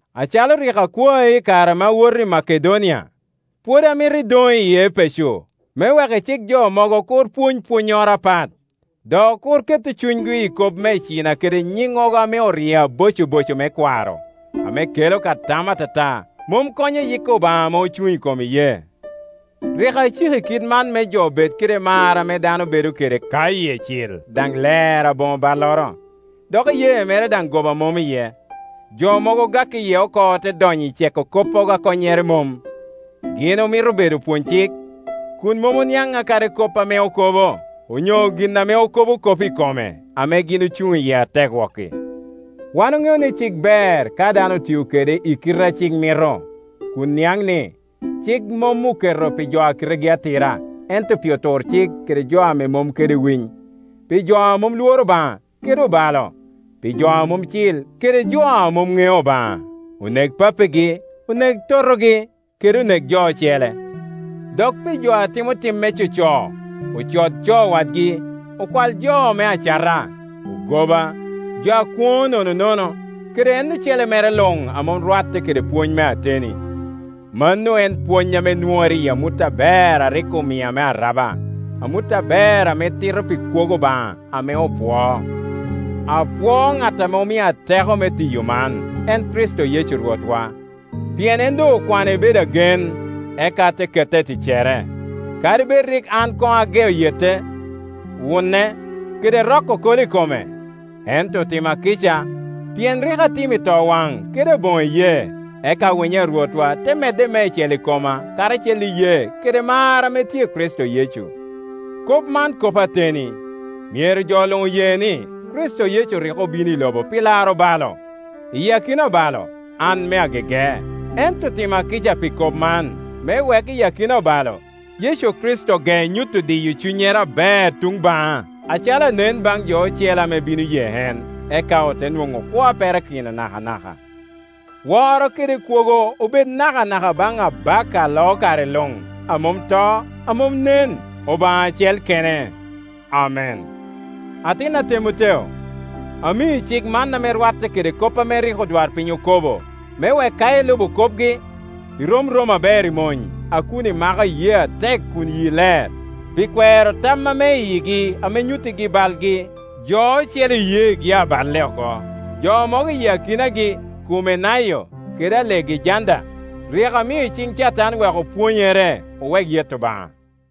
Acalo rik akwai i kare ame awoto Makedonia, pwod amito idoŋ i Epeco me wek icik jo mogo kur pwony pwonnyoro apat, dok kur keto cunygi i kop me icina kede nyiŋŋogo ame oryeo abocoboco me kwaro, ame kelo ka tam atata, mom konyo yik Obaŋa ame ocuŋ i kom iyee. Rik aciki kit man me jo bed kede mar ame dano bedo ka yie cil daŋ ler aboŋo balloro, dok iyee mere daŋ goba mom iye. Jo mogo ogak iye oko ote donyo i ceko koppogo a konnyere mom. Gin omito bedo opwony cik, kun mom oniaŋ a kadi kop ame okobo, onyo gin ame okobo kop i kome, ame gin ocuŋ iye atek wok-ki. Wan oŋeo ni cik ber ka dano otio kede i kite a cik mito, kun niaŋ ni, cik mom oketo pi jo a kitegi atira, ento pi oturcik kede jo a mom kede winy; pi jo a mom lworo Obaŋa kede obalo, pi jo a mom cil kede jo a mom ŋeo Obaŋa, onek papagi, onek totogi, kede onek jo ocele. Dok pi jo a timo tim me coco, ocod co wadgi, okwal jo me acata, ogoba, jo a kwoŋo nononono, kede en ocele mere luŋ a mom rwatte kede pwony me ateni. Mano en pwony ame nwoŋere i amut aber a rik omia me araba, amut aber ame tito pi kwogo Obaŋa ame opwoo. Apwoo ŋat ame omia teko me tiyo man, en Kricito Yecu Rwotwa, pien en doŋ okwana ibedo agen, eka te keta i ticcere, kadi bed rik an koŋ ageo yete, wune, kede roko kolo i kome. Ento otima kica, pien rik atimo i towaŋ kede aboŋo iyee, eka winyo a Rwotwa te medde meicel i koma karacel kede iyee kede mar ame tye i Kricito Yecu. Kop man kop ateni, myero jo luŋ oye ni, Kricito Yecu rik obino i lobo pi laro obalo Iyi akina obalo, an me agege; ento otima kica pi kop man, me wek i akina obalo, Yecu Kricito ge nyuto diyo cunyere aber tuŋ baŋa acalo anen baŋ jo ocele ame bino ye en, eka ote nwoŋo kwo a perakino nakanaka. Woro kede kwogo obed nakanaka baŋ Abaka a loo kare luŋ, a mom to, a mom nen, Obaŋa acel kene. Amen. Atina Temoteo, amii cik man ame rwatte kede kop ame rik odwarpiny okobo, me wek ka ilubo kopgi, irom romo aber i mony, a kun imako iyee atek kun yii ler. Pi kwero tam ame i yigi ame nyuttigi balgi, jo ocele iyeegi aballe oko. Jo mogo i akinagi Kumenayo kede Alegejanda, rik amio iciŋ Catan wek opwonyere owek yeto Obaŋa.